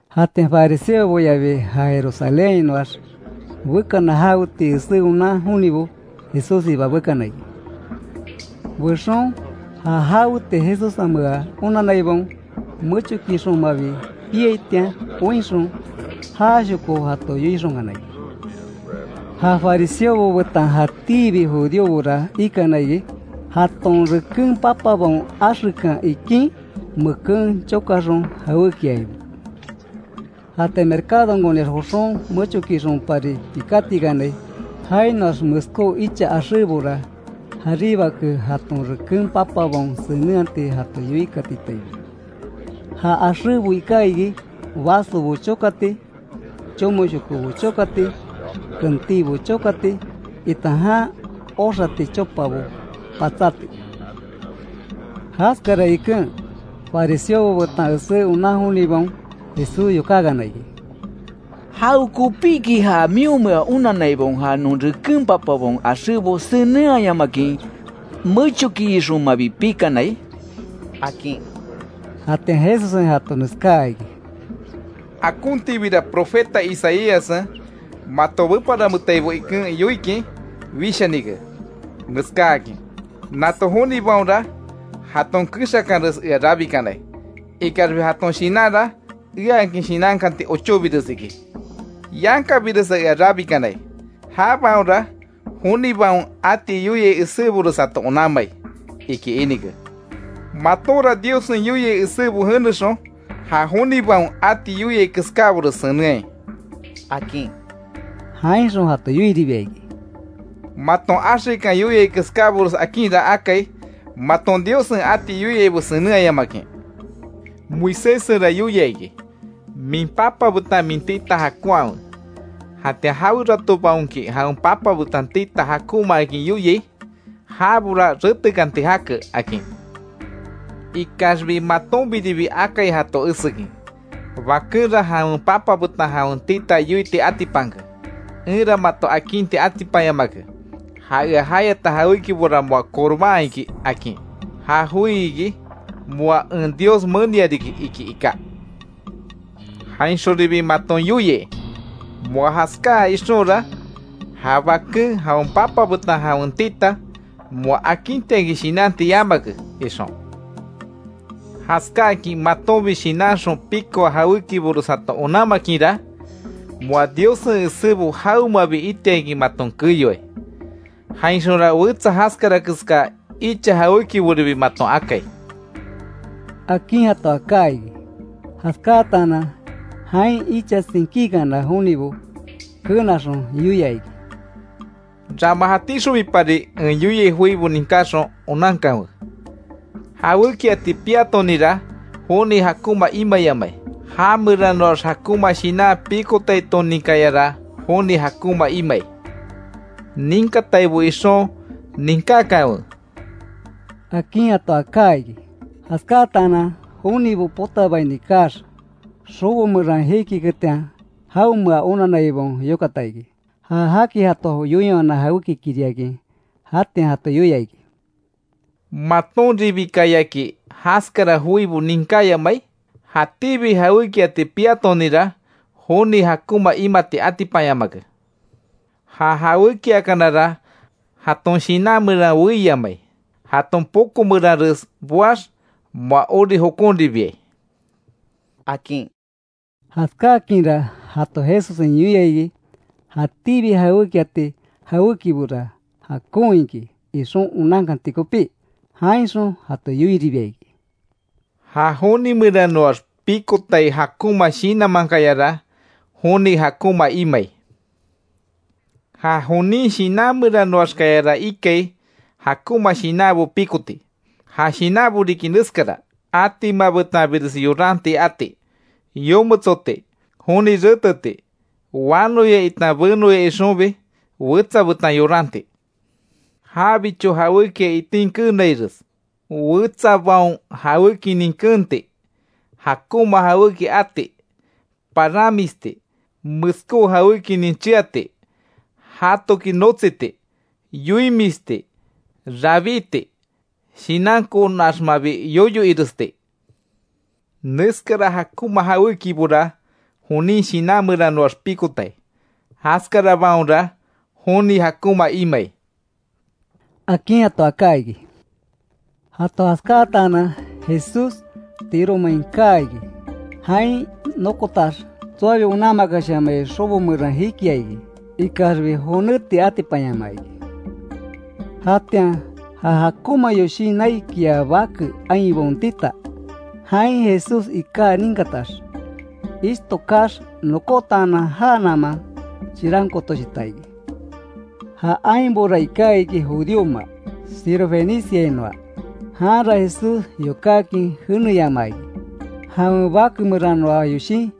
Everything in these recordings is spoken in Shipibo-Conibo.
Jatian fariseoboyabi, ja Jerusalénhainoax bekana jawetii esé onan jonibo, Jesússiba bekana iki. Bexon, ja jaweti Jesussenmea onanaibaon mechokiixonmabi piaitian oinxon, jashoko jato yoixonkana iki. Ja fariseobo betan jatíbi judíobora ikana iki, jaton reken papabaon axekan ikín, meken chokaxon jawékiaibo. Jatian mercadonkoniax joxon, mechokiixonpari pikátikanai. Jainoax meskó icha axébora jaríbake jaton reken papabaon senenhati jato yoikatitaibo. Ja axébo iká iki; vasobo chokati, chomoshokobo chokati, kentíbo chokati, itan jan oxati chopabo patsáti. Jaskara iken, fariseobo betan esé onan jonibaon, Jesús yokákana iki: —¿Jawekopiki ja mionmea onanaibaon, ja non reken papabaon axébo senenhayamakin, mechokiixonmabi pikanai? —akin. Jatian Jesussen jato neskáa iki: —Akontibira profeta Isaíassen, mato beparametaibo iken yoikin, wishanike, neskáakin: ‘Nato jonibaonra, jaton kexakanres ea rabikanai. Ikaxbi jaton shinanra eaakin shinnakanti ochóbires iki. Yankabiresa ea rabikanai. Jabaonra jonibaon ati yoiai esébores jato onanmai’, iki inike. Matonra Diossen yoiai esébo jenexon, ja jonibaon ati yoiai keskábores senenhai —akin. Jainxon jato yoiribia iki: —Maton axekan yoiai keskábores akinra akai, maton Diossen ati yoiaibo senenhayamakin. Moiséssenra yoia iki: ‘Min papa betan min tita jakonhawe’. Jatian jaweratobaonki jawen papa betan tita jakonmaakin yoiai, jabora retekanti jake, akin. Ikaxbi matonbiribi akai jato esekin, bakenra jawen papa betan jawen tita yoiti atipanke: ‘Enra mato akinti atipanyamake; ja ea jayata jawékibora moa corbán iki’, akin. Ja joi iki, (‘moa en Dios menia riki’) iki iká. Jainxonribi maton yoiai, moa jaskáa ixonra, ja baken jawen papa betan jawen tita moa akintiakin shinanti yamake, ixon. Jaskákin matonbi shinanxon pikoa jawékibores jato onanmakinra, moa Diossen esébo jawemabi itiakin maton keyoai; jainxonra wetsa jaskara keská icha jawékiboribi maton akai —akin jato aká iki. Jaskáatanan, jain icha tsinkíkana jonibo kenaxon, yoia iki: —Rama jatíxonbipari en yoiai joibo ninkáxon, onankanwe: Jawékiati piatoninra, joni jakonma imayamai, já meranoax jakonma shinan pikotaitoninkayara, joni jakonma imai. [Ninkataibo ixon, ninkákanwe] —akin jato aká iki. Jaskátaanan jonibo potabaini kaax, xobo meran jikiketian, jaonmea onanaibaon yokata iki, ja jaki jato yoinwana jawékikiriakin. Jatian jato yoia iki: —¿Matonribikayaki jaskara joibo ninkáyamai? Jatíbi jawékiati piatoninra, joni jakonma imati atipanyamake. Ja jawékiakanara, jaton shinan meran weíyamai, jaton poko meranres boax, moa ori jokonribiai —akin. Jaskáakinra, jato Jesussen yoia iki, jatíbi jawékiati jawékibora, jakon iki ixon onankanti kopí. Jainxon jato yoiribia iki: —Ja joni meranoax pikotai jakonma shinanmankayara joni jakonma imai. Ja jonin shinan meranoaxkayara ikai jakonma shinanbo pikoti. Ja shinanbo riki neskara: Atima betanbires yoranti ati, yometsoti, joni reteti, wanoya itan benoya ixonbi wetsa betan yoranti, jabicho jawékia itin keenaires, wetsabaon jawékinin kenti, jakonma jawéki ati, paranmisti, meskó jawékinin cheati, jatoki notsiti, yoimisti, rabíti, shinankonaxmabi yoyo iresti. Neskara jakonma jawékibora, jonin shinan meranoax pikotai. Jaskarabaonra joni jakonma imai —akin jato aká iki. Jato jaskáatanan, Jesús Tiro main kaa iki. Jain nokotax, tsoabi onanmakashamai xobo meran jikia iki, ikaxbi, jonéti atipanyamaa iki. Jatian, ja jakonma yoshin naikia bake ainbaon tita, jain Jesús iká ninkatax, ishto kaax nokótaanan jánaman chirankootoshita iki. Ja ainbora iká iki judíoma, Sirofeniciainoa. Janra Jesús yokákin jeneyamaa iki, jawen bake meranoa yoshin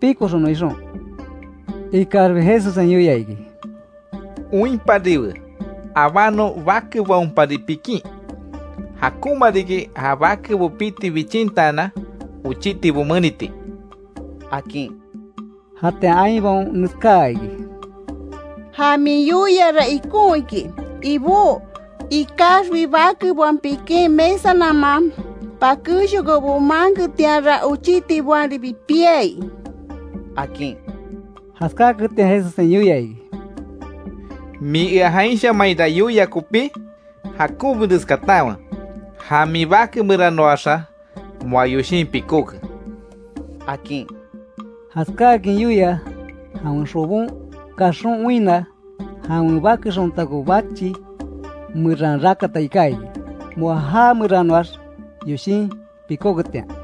pikoxonon ixon. Ikaxbi Jesussen yoia iki: —Oinpariwe. Abánon bakebaonpari pikín. Jakonma riki ja bakebo piti bichintaanan, ochitibo meniti —akin. Jatian ainbaon neskáa iki: —Ja min yoiara ikon iki, Ibó. Ikaxbi bakebaon pikin mesa naman pakéxshokobo maanketianra, ochítibaonribi piai —akin. Jaskáaketian Jesussen yoia iki: —Min ea jainshamainra yoia kopí, jakonbires katanwe. Ja min bake meranoaxa moa yoshin pikóke —akin. Jaskáakin yoia, jawen xobon kaxon oinna, jawen bake xontako bachi meran rakata iká iki, moa já meranoax yoshin pikóketian.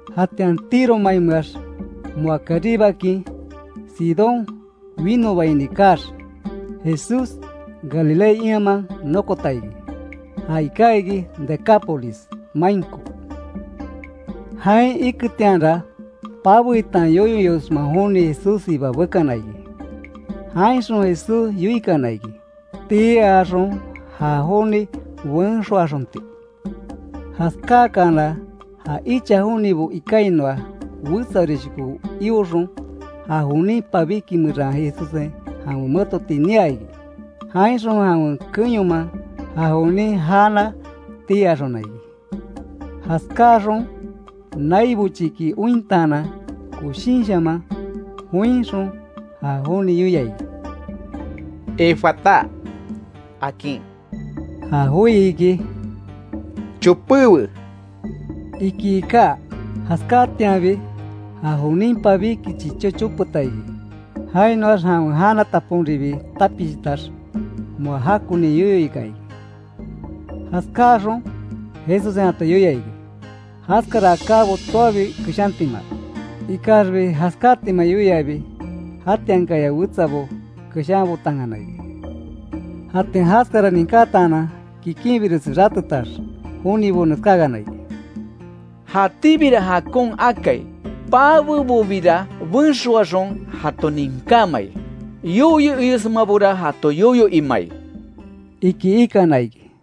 Jatian Tiro mainmeax, moa karíbakin, Sidón winobaini kaax, Jesús Galilea ianman nokota iki, ja iká iki Decápolis mainko. Jain iketianra, pabe itan yoyo iosma joni Jesússiba bekana iki. Jainxon Jesús yoikana iki; tii axon ja joni benxoaxonti. Jaskáakana, ja icha jonibo ikainoa, wetsaorishoko ioxon ja jonin pabíki meran Jesussen jawen metoti niaa iki. Jainxon jawen keyonman, ja jonin jana tii axona iki. Jaskáxon, nai bochiki ointaanan koshinshaman joinxon, ja joni yoia iki: “Efatá”, akin. Ja joi iki, “chopéwe”, iki iká. Jaskáatianbi, ja jonin pabíki chichó chopeta iki. Jainoax jawen jana, taponribi tapishitax, moa jakoni yoyo ika iki. Jaskáaxon, Jesussen jato yoia iki, jaskara akábo tsoabi keshantima. Ikaxbi jaskátima yoiabi, jatiankaya wetsabo keshanbotankana iki. Jatian jaskara ninkataanan, kikinbiresi ratetax, jonibo neskákana iki: —Jatíbira jakon akai. Pabebobira benxoaxon, jato ninkámai. Yoyo iosmabora, jato yoyo imai —iki ikana iki.